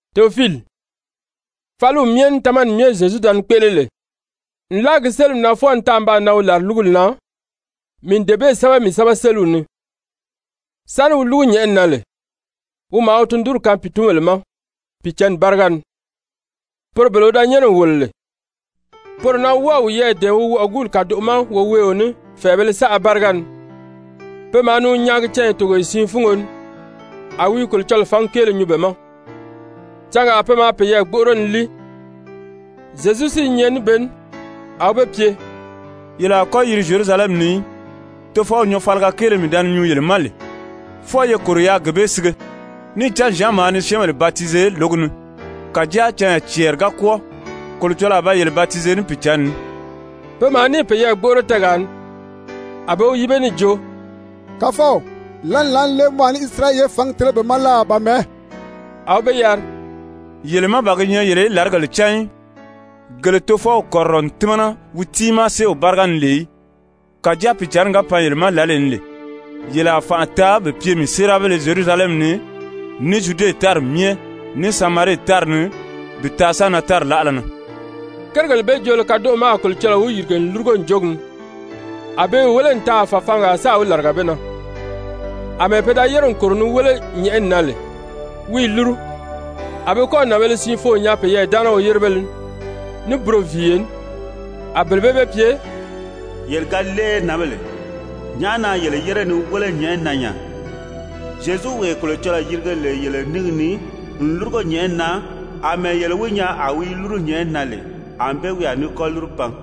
Teofiili, fáliw myɛ ní tamani myɛ Zyezu da ni kpéʔele lè nlaa gi sélimi na fwɔɔ n taa n baa nan wi làrilúguli na, mii n dee bee sɛ́bɛ mii sɛ́bɛseliw ni. Sáni wi lúgu nyɛ̀ʔɛni na lè, wi maa wi tundunri kaan pìitunbèle ma Pìicǎnni báriga ni, poro bele wi da nyɛ́nɛ n wòlo lè. Poro na wi wɔ́ɔ̀ wiyɛɛ dɛ̀ɛn wi wɔʔɔguuli kàdoʔo ma woweeo ní fɛ̀ɛbēle saʔa báriga ni. Pe maa ni wi nyaagi canya togoye siin fúngo ni, a wi i Kolocɔlɔɔ fǎngi kéele nyuu be ma. Cangaa pe maa peyɛɛ gbóʔoro ni líi, Zyezu si i nyɛ ní be ní, a wi be pye: «Yele a kɔ́ yiri Zyerusalɛmi ni í, Tofɔw nyɔɔfaliga kéele mii da ni nyuu yele ma lè, fwɔɔ ye kòro yaa gee bee sige. Níì cán Zyan maa ni syɛ́ɛnbèle batize lǒgi ni, kàjáa canya cɛɛri ga kwɔ́ɔ, Kolocɔlɔɔ a ba yele batize ní Pìicǎnni ní.» Pe maa níì peyɛɛ gbóʔoro tɛɛgaa ni, a be wi yíbe níì jo: «Kàfɔw, lǎli naa ni lé mɔ a ní Isirayɛli ye fǎngi télege be ma láà ba mɛ̀ɛ́?» A wi be yari: «Yele má ban gi nyɛ yele í làrigèle cán í, gele Tofɔw kɔ̀rirɔ n tímana wi tiimaa séew báriga ni lè í. Kàjáa Pìicǎnni ga pan yele ma lǎlee ni lè, yele a fànʔa taa bi pye mii séerabéle Zyerusalɛmi ni, ní Zyude tári myɛ, ní Samarii tári ní, bi taa sa nan tári láʔala na.» Kérigèle bee joolo kadoʔo ma a Kolocɔlɔɔ wi yìrige n lúrugo ǹjogi ni, a be i wi wéle n taa a fàfaangaa sáà wi làriga be na. Amɛɛ pe da yére n kòro ni wéle nyɛ̀ʔɛni na lè wí i lúru, a be kɔ́ɔ̀ nànbēle siin foo n nyaa peyɛɛ daana woyérebéle ní, ní buroviiye ní. A bele bee be pye: «Yele Galile ye nǎnbèle, nyàʔá na yele yére ni wéle nyɛ̀ʔɛni na nya? Zyezuwee Kolocɔlɔɔ yirige lè yele níngi ni n lúrugo nyɛ̀ʔɛni na, àmɛɛ yele wi nyaa a wi i lúru nyɛ̀ʔɛni na lè, ànbée wi a ní kɔ́ lúru pan.»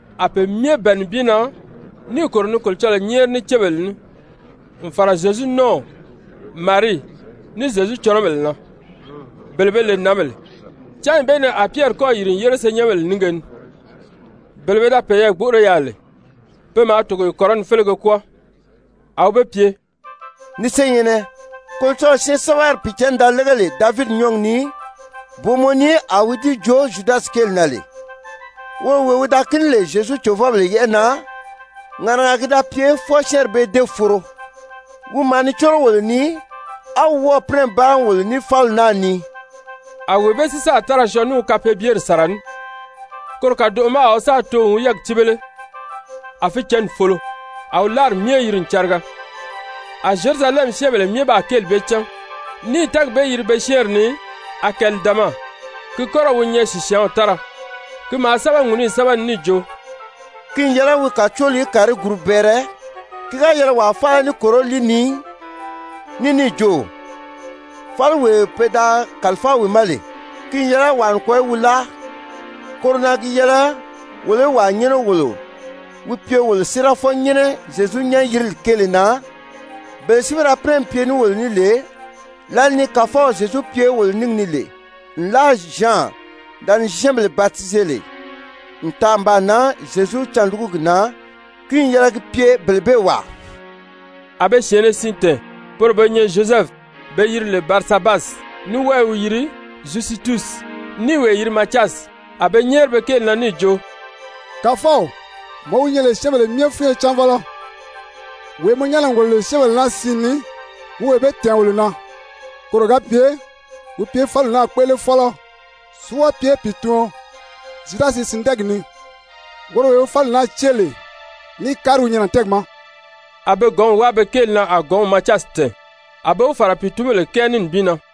A pe myɛ bɛ̀ɛ nibin na níì kòro ni Kolocɔlɔɔ nyɛ́ɛri ní cébèle ní, n fàra Zyezu nɔ́ɔw Marii, ní Zyezu cɔnɔbèle na, bele be lè nǎnbèle. Cányi bee ni a Pyɛri kɔ́ɔ̀ yìri n yére senyɛnbèle nínge ni. (Bele pe da peyɛɛ gbóʔoro yaà lè, pe maa togoye kɔrɔni félege kwɔ́ɔ.) A wi be pye: «Ni senyɛ̀nnɛ, Kolocɔlɔɔ syɛɛnsɛbɛri Pìicǎnni da lége lè Davidi nyɔ́ɔgi ni booma ni a wi di joo Zyudasi kéeli na lè, woro wee wi da kíni lè Zyezu còvɔbèle yɛ́ʔɛ na, ŋàʔanaga ki da pye fwɔɔ syɛ́ɛnri bee í dée foro. Wi maa ni córo wolo ni, á wi wɔ́ɔ̀ pínɛ ni báara ní wolo ní fáliw naa ni. A wee bee si sáà tára syɔɔ ní wi kapeebyeri sàra ní. Koro kàdoʔo ma a wi too n yɛ́ɛgi cíbele, a fícɛnni folo, a wi láari myɛ yiri n cariga. A Zyerusalɛmi syɛ́ɛnbèle myɛ baa kéeli bee cán, ní i tɛ́ɛgi bee yiri be syɛ́ɛnri ni Akɛlidama, ki kɔ́rɔw wi nyɛ Sìsyaanw Tára. Ki maa sɛ́bɛ Ŋúnuyi Sɛ́bɛ ni níì jo: ‹Ki n yɛlɛ wi kàcooli í kàri gurubɛɛrɛ. Ki ga yɛlɛ wàa faala í ní kòro li ni í.› ní níì jo: ‹Fáliwee pe da kàlifáa wi ma lè, Ki n yɛlɛ wàa nikwɔɔ í wi láa.› Koro na gi yɛlɛ wolo í wàa nyɛ́nɛ wòlo wi pye wolo séerafɔ-nyɛ́nnɛ Zyezu nyán-yirili kéele na, bele si pe da pínɛ n pye ní wolo ní lè lǎli ni Kàfɔw Zyezu pye wolo níngi ni lè nlaa Zyan da ni syɛ́ɛnbèle batize lè n taa n baa nan Zyezu cânlúgugi na, ki n yɛlɛ gi pye bele bee wàa.» A be syɛ̀ɛnnɛ siin tɛ̀ɛn, poro be nyɛ Zyozɛfu be yiri lè Barisabasi ní wɔ́ɔ i wi yiri Zyusitusi, ní i wee yiri Matyasi. A be nyɛ́ɛri be kéeli na níì jo: «Kàfɔw, mɔ wi nyɛ lè syɛ́ɛnbèle myɛ fúnyo cánvɔlɔ, wee mɔ nyɛ́nɛ n wòlo lè syɛ́ɛnbèle naa siin ni, mi wee bee tɛ̀ɛn wolo na, koro ga pye wi pye fáliw naa kpéʔelefɔlɔ, si wɔ́ɔ pye pìituɔn Zyudasi sìndɛɛgi ni, woro wee wi fáliw naa cée lè níì kári wi nyɛnɛ tɛ́ɛgi ma.» A be gɔ̌nw wáa be kéeli na a gɔ̌nw Matyasi tɛ̀ɛn, a be wi fàra pìitunbèle kɛɛ ní nibin na.